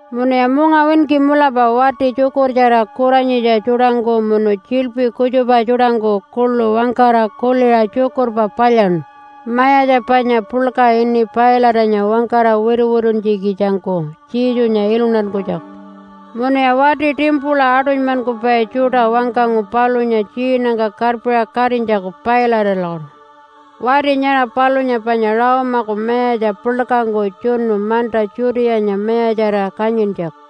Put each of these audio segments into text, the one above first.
Munuya mungawinki mulapa wati tjukurtjara kuranyitja tjuṯangku munu tjiḻpi kutjupa tjuṯangku kuḻu wangkara kuliṟa tjukurpa palyaṉu mayatja panya puḻka ini Pilate-anya wangkara wituwituntjikitjangku Jesunya iluntankunytjaku. Munuya wati timpula aṯunymankupai tjuṯa wangkangu palunya tjiinangka karpiṟa katinytjaku Pilate-alakutu. Wati nyara palunya panya Rome-aku mayatja puḻkangku tjunu manta Judeanya mayatjarira kanyintjaku.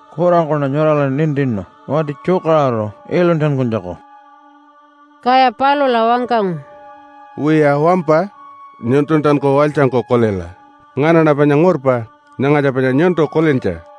“Kurangkuṉa nyurala nintinu wati tjukaṟuru iluntankunytjaku.” Kaya palula wangkangu, “Wiya, wampa. Nyuntultanku walytjangkulta kulila! Nganaṉa panya ngurpa. Nyangatja panya nyuntu kulintja!”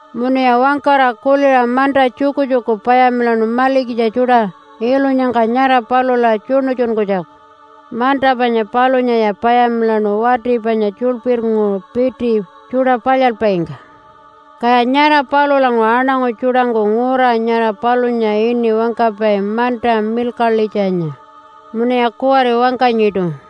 Munuya wangkara kuliṟa manta tjukutjuku payamilaṉu malikitja tjuṯa ilunyangka nyara palula tjuṉutjunkunytjaku. Manta panya palunyaya payamilaṉu wati panya tjuḻpirnguṟu piti tjuṯa palyalpaingka. Kaya nyara palulanguṟu aṉangu tjuṯangku ngura nyara palunya ini wangkapai, Manta milkaḻitjanya munuya kuwari wangkanyiṯu.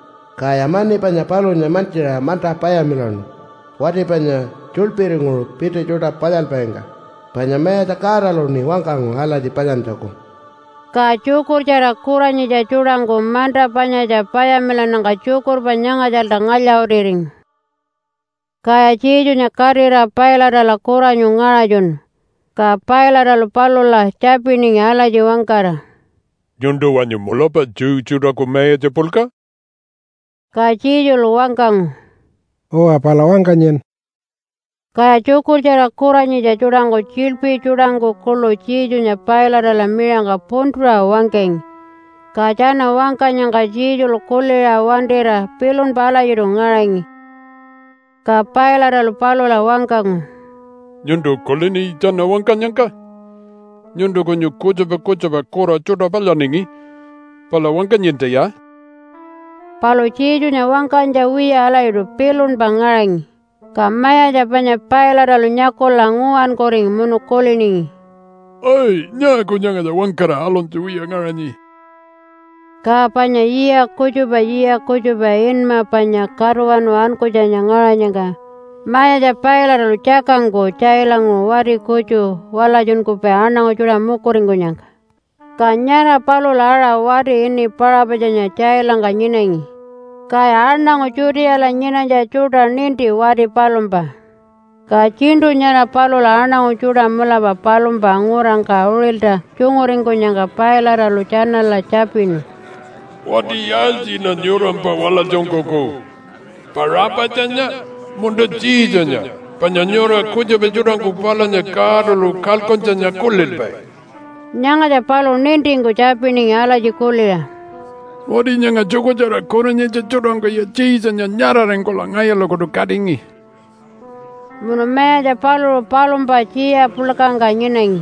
Kaya mani panya palunya mantjiṟa manta payamilaṉu wati panya tjuḻpirnguṟu piti tjuṯa palyalpaingka, panya Mayatja Godaluṉi wangkangu alatji palyantjaku.” Ka tjukurtjara kuranyitja tjuṯangku manta panyatja payamilannyangka tjukurpa nyangatjalta ngalya-utiringu. Kaya Jesunya katira Pilate-ala kuranyu ngaṟatjunu, ka Pilate-alu palula tjapiningi alatji wangkara, “Nyuntu wanyu mulapa Jew tjuṯaku mayatja puḻka?” Ka Jesulu wangkangu, “Uwa, pala wangkanyin.” Kaya tjukurtjara kuranyitja tjuṯangku tjiḻpi tjuṯangku kuḻu Jesunya Pilate-ala miṟangka puntuṟa wangkangi. Ka tjana wangkanyangka Jesulu kuliṟa wantira pilunpa alatjiṯu ngaṟangi. Ka Pilate-alu palula wangkangu, “Nyuntu kulini tjana wangkanyangka? Nyuntu kunyun kutjupa kutjupa kura tjuṯa palyaningi, pala wangkanyintaya.” Palu Jesunya wangkanytja wiya alatjiṯu pilunpa ngaṟangi, ka mayatja panya Pilate-alu nyakula nguwankuringi munu kuliningi, “Ai! Nyaaku nyangatja wangkara aluntja wiya ngaṟanyi?” Ka panya yiya kutjupa yiya kutjupa inma panya Katuwanu Ankunytjanya ngaṟanyangka mayatja Pilate-alu tjakangku tjailanguṟu wati kutju walatjunkupai aṉangu tjuṯa mukuringkunyangka. Ka nyara palula aṟa wati ini Paṟapatjanya tjailangka nyinangi, kaya aṉangu Judeala nyinanytja tjuṯa ninti wati palumpa. Ka tjiṉṯu nyara palula aṉangu tjuṯa mulapa palumpa ngurangka uṟilta tjunguringkunyangka Pilate-alu tjanala tjapinu, “Wati yaaltjiṉa nyurampa walatjunkuku Paṟapatjanya, munta Jesunya panya nyura kutjupa tjuṯangku palunya Godalu kalkuntjanya kulilpai?” Nyangatja paluṟu nintingku tjapiningi alatji kuliṟa, “Wati nyanga tjukurtjara kuranyitja tjuṯangkuya Jesunya nyaṟaringkula ngayulakutu katingi.” Munu mayatja paluṟu palumpa tjiya puḻkangka nyinangi,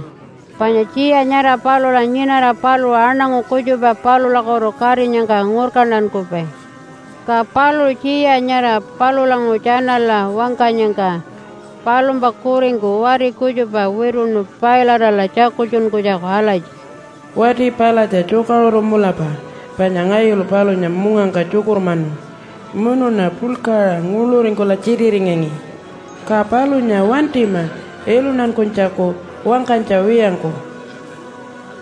panya tjiya nyara palula nyinara paluṟu aṉangu kutjupa palulakutu katinyangka ngurkantankupai. Ka paluṟu tjiya nyara palulanguṟu tjanala wangkanyangka palumpa kuringku wati kutjupa wituṉu Pilate-ala tjakultjunkunytjaku alatji, “Wati palatja tjukaṟuru mulapa, panya ngayulu palunya mungangka tjukurmanu munuṉa puḻkaṟa nguḻuringkula tjititingangi. Ka palunya wantima iluntankunytjaku wangkanytja wiyangku.”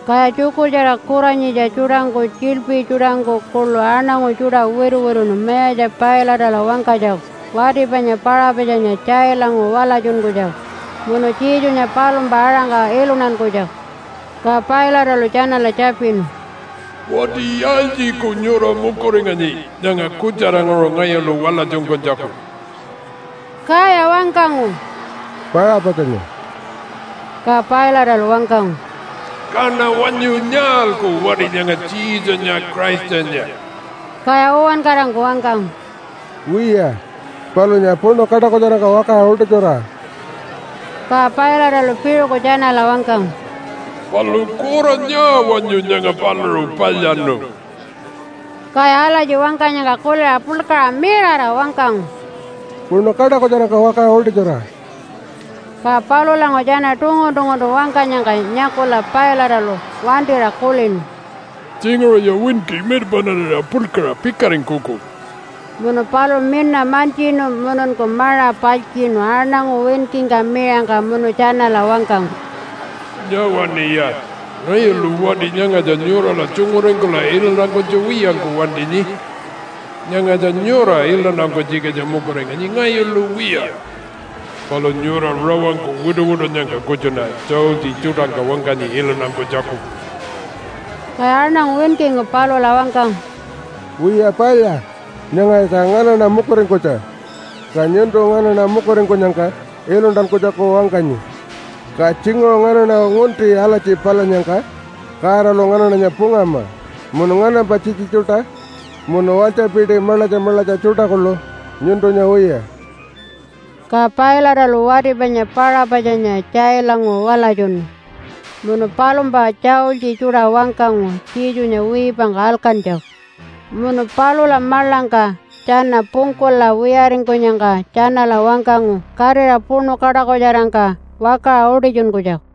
Kaya tjukurtjara kuranyitja tjuṯangku, tjiḻpi tjuṯangku kuḻu aṉangu tjuṯa wituwituṉu mayatja Pilate-ala wangkanytjaku wati panya Paṟapatjanya tjailanguṟu walatjunkunytjaku munu Jesunya palumpa aṟangka iluntankunytjaku. Ka Pilate-alu tjanala tjapinu, “Wati yaaltjiku nyura mukuringanyi nyanga kutjaranguṟu ngayulu walatjunkunytjaku?” Kaya wangkangu, “Paṟapatjanya!” Ka Pilate-alu wangkangu, “Kaṉa wanyu nyaalku wati nyanga Jesunya Christanya?” Kaya uwankarangku wangkangu, “Wiya, palunya puṉu kaṯakutjarangka wakaṟa utitjura!” Ka Pilate-alu piṟuku tjanala wangkangu, “Palu kura nyaa wanyu nyanga paluṟu palyaṉu?” Kaya alatji wangkanyangka kuliṟa puḻkaṟa mirara wangkangu, “Puṉu kaṯakutjarangka wakaṟa utitjura!” Ka palulanguṟu tjana tungun-tunguntu wangkanyangka nyakula Pilate-alu wantira kulinu, “Tjinguṟuya winki mirpaṉarira puḻkaṟa pikaringkuku.” Munu paluṟu mina mantjinu mununku maṟa paltjiṉu aṉangu winkingka miṟangka munu tjanala wangkangu, “Nyawaṉiya! Ngayulu wati nyangatja nyurala tjunguringkula iluntankunytja wiyangku wantinyi. Nyangatja nyura iluntankunytjikitja mukuringanyi ngayulu wiya. Palu nyura rawangku wituwitunnyangka kutjuṉa tjaultji tjuṯangka wangkanyi iluntankunytjaku.” Kaya aṉangu winkingku palula wangkangu, “Wiya, palya, nyangatja nganaṉa mukuringkunytja, ka nyuntu nganaṉa mukuringkunyangka iluntankunytjaku wangkanyi. Ka tjinguṟu nganaṉa ngunti alatji palyannyangka Godalu nganaṉanya pungama munu nganampa tjitji tjuṯa munu walytjapiti maḻatja maḻatja tjuṯa kuḻu nyuntunya wiya.” Ka Pilate-alu wati panya Paṟapatjanya tjailanguṟu walatjunu munu palumpa tjaultji tjuṯa wangkangu Jesunya wiipangka alkantjaku. Munu palula maḻangka tjana pungkula wiyaringkunyangka tjanala wangkangu katira puṉu kaṯakutjarangka wakaṟa utitjunkunytjaku.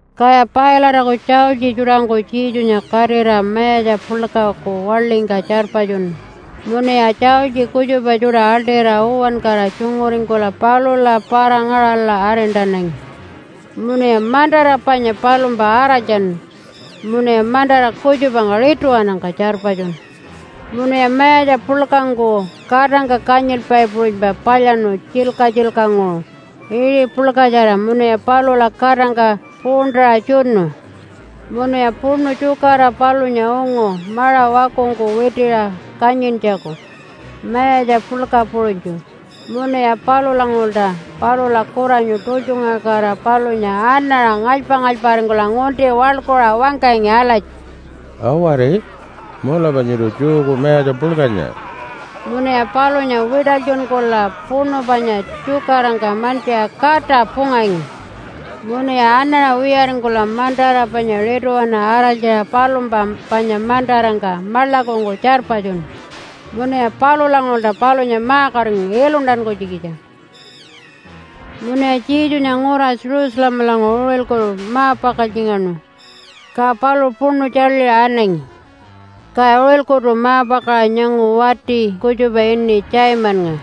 Kaya Pilate-aku tjaultji tjuṯangku Jesunya katira mayatja puḻkaku waḻingka tjarpatjunu munuya tjaultji kutjupa tjuṯa aḻṯira uwankara tjunguringkula palula para-ngaṟala arintanangi. Munuya mantara panya palumpa araltjanu munuya mantara kutjupangka rituwanangka tjarpatjunu. Munuya mayatja puḻkangku katangka kanyilpai puṟunypa palyaṉu tjilka-tjilkanguṟu iṟi puḻkatjara munuya palula katangka puṟuntaṟa tjunu. Munuya puṉu tjukara palunya ungu maṟa wakungku witiṟa kanyintjaku mayatja puḻka puṟunytju, munuya palulanguṟulta palula kuranyu tultjungaṟakatira palunya anaṟa ngalypa-ngalyparingkula ngunti waḻkuṟa wangkangi alatji, “Awari! Mulapa nyuntu Jewku mayatja puḻkanya.” Munuya palunya wiṯalytjunkula puṉu panya tjukarangka mantjiṟa kata pungangi. Munuya anaṟa wiyaringkula mantara panya rituwana araltjaṟa palumpa panya mantarangka maḻakungku tjarpatjunu. Munuya palulanguṟulta palunya ma-katingu iluntankunytjikitjangku. Munuya Jesunya ngura Jerusalemalanguṟu uṟilkutu ma-pakaltjingaṉu, ka paluṟu puṉu tjaḻiṟa anangi. Kaya uṟilkutu ma-pakaṟa nyangu wati kutjupa ini Simonnga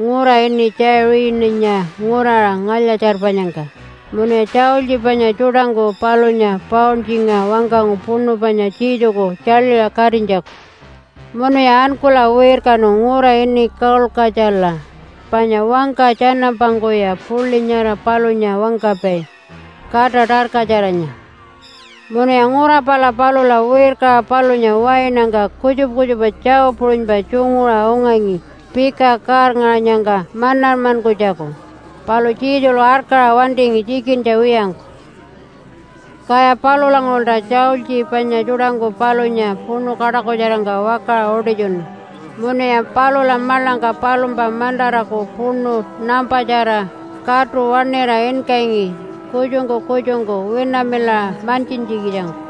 ngura ini Tjaiṟininya nguraṟa ngalya-tjarpanyangka munuya tjaultji panya tjuṯangku palunya pauntjingaṟa wangkangu puṉu panya Jesuku tjaḻiṟa katinytjaku. Munuya ankula wirkanu ngura ini Kaulkatjala panya wangka tjanampangkuya puḻi nyara palunya wangkapai, Kata Tarkatjaranya. Munuya ngura pala palula wirkaṟa palunya wainangka kutjupa kutjupa tjau puṟunypa tjunguṟa ungangi pika kaarngaṟanyangka manarmankunytjaku, palu Jesulu arkaṟa wantingi tjikintja wiyangku. Kaya palulanguṟulta tjaultji panya tjuṯangku palunya puṉu kaṯakutjarangka wakaṟa utitjunu, munuya palula maḻangka palumpa mantaraku puṉu nampatjara katu waṉira inkangi kutjungku kutjungku winamilaṟa mantjintjikitjangku.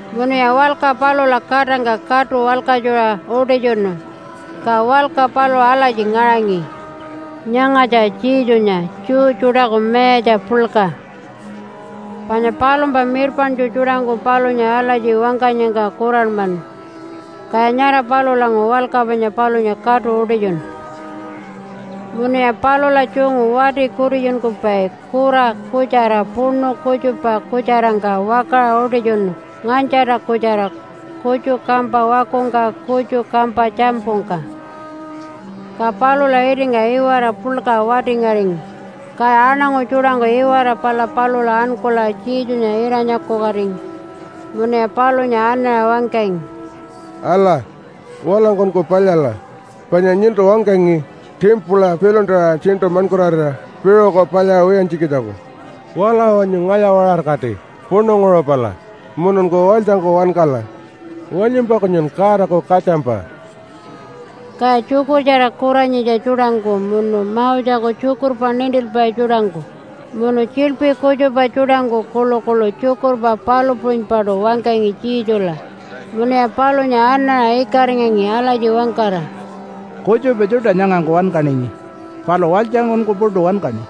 Munuya walka palula katangka katu walkatjuṟa utitjunu, ka walka paluṟu alatji ngaṟangi, Nyangatja Jesunya Jew Tjuṯaku Mayatja Puḻka Panya palumpa mirpaṉtju tjuṯangku palunya alatji wangkanyangka kuranmanu, kaya nyara palulanguṟu walka panya palunya katu utitjunu. Munuya palula tjungu wati kutitjunkupai kura kutjara puṉu kutjupa kutjarangka wakaṟa utitjunu nganytjarta kutjara, kutju kampa wakungka kutju kampa tjampungka. Ka palula itingka iwara puḻka wati-ngaringi, kaya aṉangu tjuṯangku iwara pala palula ankula Jesunya ira-nyakukatingi munuya palunya anaṟa wangkangi, “Ala! Walangkunku palyala, panya nyuntu wangkangi timpula piḻuntara tjiṉṯu maṉkurarira piṟuku palyaṟa wiyantjikitjangku. Wala wanyu ngalya-waṟarakati puṉunguṟu pala, mununku walytjangku wankala. Wanyumpa kunyun Godaku katjampa!” Kaya tjukurtjara kuranyitja tjuṯangku munu Moseku tjukurpa nintilpai tjuṯangku munu tjiḻpi kutjupa tjuṯangku kuḻukuḻu tjukurpa palu puṟunypaṯu wangkangi Jesula munuya palunya anaṟa ikaringangi alatji wangkara, “Kutjupa tjuṯa nyangangku wankaningi, palu walytjangkunku puṯu wankaṉi.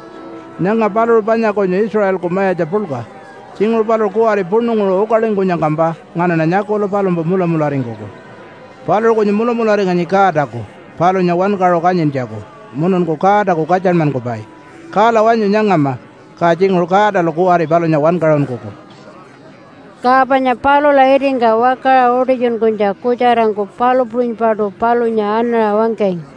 Nyanga paluṟu panya kunyu Israelku mayatja puḻka. Tjinguṟu paluṟu kuwari puṉunguṟu ukalingkunyangkampa nganaṉa nyakula palumpa mulamularingkuku. Paluṟu kunyu mulamularinganyi Godaku palunya wankaṟu kanyintjaku mununku Godaku katjanmankupai. Kala wanyu nyangama ka tjinguṟu Godalu kuwari palunya wankaṟunkuku.” Ka panya palula itingka wakaṟa utitjunkunytja kutjarangku palu puṟunypaṯu palunya anaṟa wangkangi.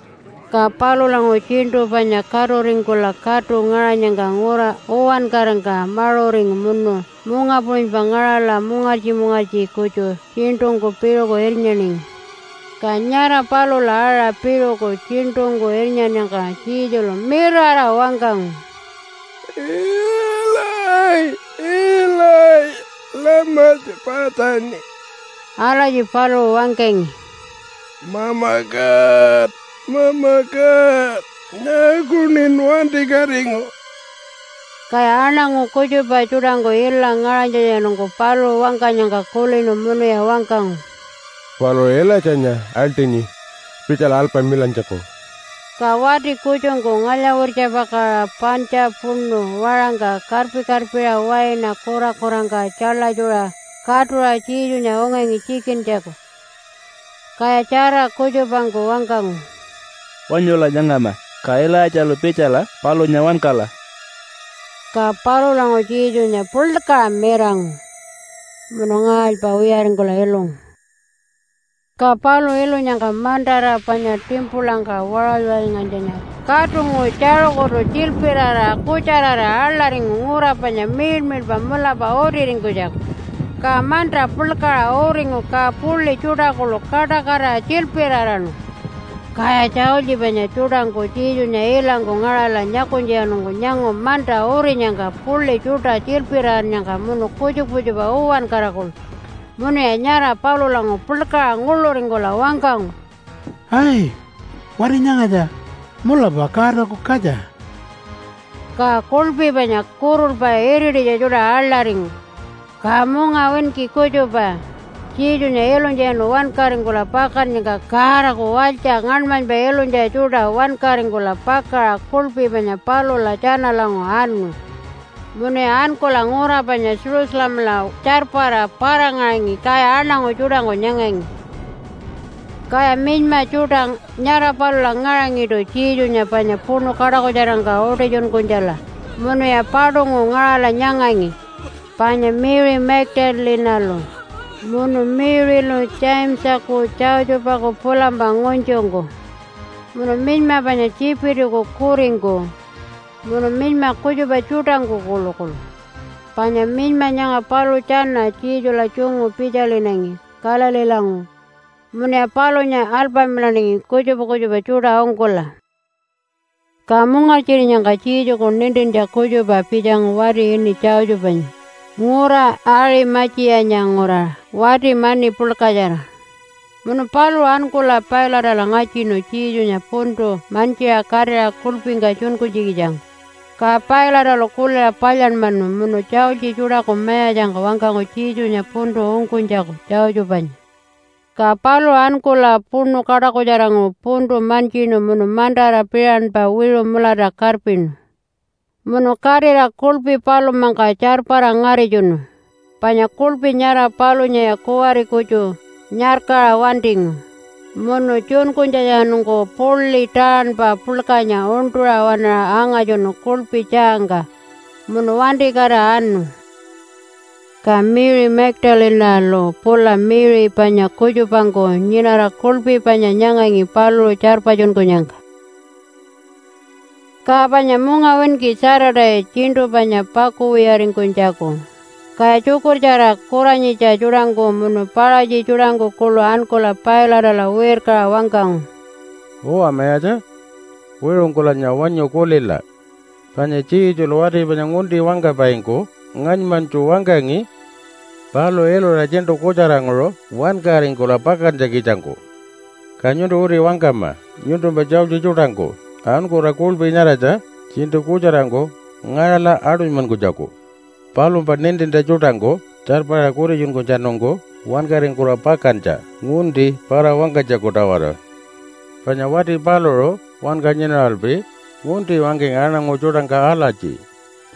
Ka palulanguṟu tjiṉṯu panya katuringkula katu ngaṟanyangka ngura uwankarangka maṟuringu munu munga puṟunypa ngaṟala mungartji-mungartji kutju tjiṉṯungku piṟuku irnyaningi. Ka nyara palula aṟa piṟuku tjiṉṯungku irnyannyangka Jesulu mirara wangkangu, “Ilayi! Ilayi! Lama tjapatjani?” Alatji paluṟu wangkangi, “Mama God, Mama God! Nyaakuṉin wantikatingu?” Kaya aṉangu kutjupa tjuṯangku ila ngaṟanytjatjanungku paluṟu wangkanyangka kulinu munuya wangkangu, “Paluṟu Ilaitjanya aḻṯinyi pitjala alpamilantjaku.” Ka wati kutjungku ngalya-wirtjapakaṟa pantja puṉu waṟangka karpi-karpiṟa waina kurakurangka tjaḻatjuṟa katuṟa Jesunya ungangi tjikintjaku. Kaya tjara kutjupangku wangkangu, “Wanyula nyangama, ka Ilaitjalu pitjala palunya wankala.” Ka palulanguṟu Jesunya puḻkaṟa mirangu munu ngaalypa wiyaringkula ilungu. Ka paluṟu ilunyangka mantara panya timpulangka waṟaly-waṟalyngaṟanytjanya katunguṟu tjaṟukutu tjilpiraraṟa kutjararira aḻaringu ngura panya miḻmiḻpa mulapa utiringkunytjaku. Ka manta puḻkaṟa uringu, ka puḻi tjuṯa kuḻu kaṯakatira tjilpiraraṉu. Kaya tjaultji panya tjuṯangku Jesunya ilangku ngaṟala nyakunytjatjanungku nyangu manta urinyangka, puḻi tjuṯa tjilpirarannyangka munu kutjupa kutjupa uwankara kuḻu, munuya nyara palulanguṟu puḻkaṟa nguḻuringkula wangkangu, “Ai! Wati nyangatja mulapa Godaku katja.” Ka kuḻpi panya kurulpa irititja tjuṯa aḻaringu, ka mungawinki kutjupa Jesunya ilunytjatjanu wankaringkula pakannyangka Godaku walytja ngaṉmanypa ilunytja tjuṯa wankaringkula pakaṟa kuḻpi panya palula tjanalanguṟu anu munuya ankula ngura panya Jerusalemala tjarpara para-ngaṟangi, kaya aṉangu tjuṯangku nyangangi. Kaya minyma tjuṯa nyara palula ngaṟangiṯu Jesunya panya puṉu kaṯakutjarangka utitjunkunytjala munuya paṯunguṟu ngaṟala nyangangi, panya Mary Magdalene-alu munu Mary-lu Jamesaku Josephaku pulampa ngunytjungku, munu minyma panya Tjipitiku kuringku munu minyma kutjupa tjuṯangku kuḻukuḻu. Panya minyma nyanga paluṟu tjana Jesula tjungu pitjalinangi Galileelanguṟu munuya palunya alpamilaningi kutjupa kutjupa tjuṯa ungkula. Ka mungartjirinyangka Jesuku nintintja kutjupa pitjangu wati ini Josephanya ngura Aṟima-tjiyanya nguraṟa wati mani puḻkatjara. Munu paluṟu ankula Pilate-ala ngatjinu Jesunya puntu mantjiṟa katira kuḻpingka tjunkunytjikitjangku. Ka Pilate-alu kuliṟa palyanmanu munu tjaultji tjuṯaku mayatjangka wangkangu Jesunya puntu ungkunytjaku Josephanya. Ka paluṟu ankula puṉu kaṯakutjaranguṟu puntu mantjinu munu mantara piṟanpa wiṟu mulata karpinu. Munu katira kuḻpi palumpangka tjarpara ngaritjunu, panya kuḻpi nyara palunyaya kuwari kutju nyarkaṟa wantingu. Munu tjunkunytjatjanungku puḻi taaṉpa puḻkanya uṉṯuṟa waṉaṟa angatjunu kuḻpi tjaangka, munu wantikatira anu. Ka Mary Magdalene-alu pula Mary panya kutjupangku nyinara kuḻpi panya nyangangi paluṟu tjarpatjunkunyangka. Ka panya mungawinki Saturday tjiṉṯu panya pakuwiyaringkunytjaku, kaya tjukurtjara kuranyitja tjuṯangku munu Paṟatji tjuṯangku kuḻu ankula Pilate-ala wirkaṟa wangkangu, “Uwa mayatja wiṟungkulanya wanyu kulila! Panya Jesulu wati panya ngunti wangkapaingku ngaṉmanytju wangkangi paluṟu ilura tjiṉṯu kutjaranguṟu wankaringkula pakantjikitjangku. Ka nyuntu uti wangkama nyuntumpa tjaultji tjuṯangku ankula kuḻpi nyaratja tjiṉṯu kutjarangku ngaṟala aṯunymankunytjaku, palumpa nintintja tjuṯangku tjarpara kutitjunkunytjatjanungku wankaringkula pakantja ngunti para-wangkanytjaku-tawara. Panya wati paluṟu wanka nyinaralpi ngunti wangkangi aṉangu tjuṯangka alatji,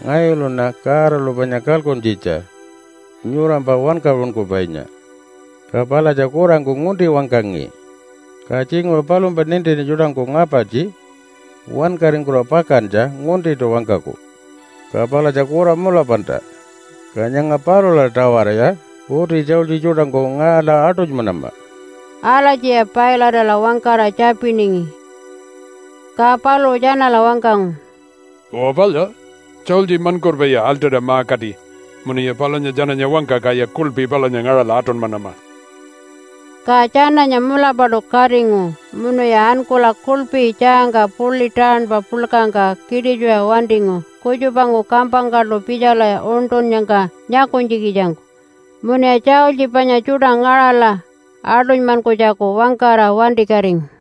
‘Ngayuluṉa Godalu panya kalkuntjitja nyurampa Wankaṟunkupainya.’ Ka palatja kurangku ngunti wangkangi, ka tjinguṟu palumpa nintintja tjuṯangku ngapartji wankaringkula pakantja nguntiṯu wangkaku, ka palatja kura mulapalta. Ka nyanga palula-tawaraya uti tjaultji tjuṯangku ngaṟala aṯunymanama.” Alatjiya Pilate-ala wangkara tjapiningi. Ka paluṟu tjanala wangkangu, “Uwa palya! Tjaultji maṉkurpaya aḻṯira ma-kati munuya palunya tjananya wangka kaya kuḻpi palunya ngaṟala aṯunymanama.” Ka tjananya mulapaṯu katingu munuya ankula kuḻpi tjaangka puḻi taaṉpa puḻkangka kiṯitjuṟa wantingu kutjupangku kampangkaṯu pitjala uṉṯunnyangka nyakunytjikitjangku, munuya tjaultji panya tjuṯa ngaṟala aṯunymankunytjaku wangkara wantikatingu.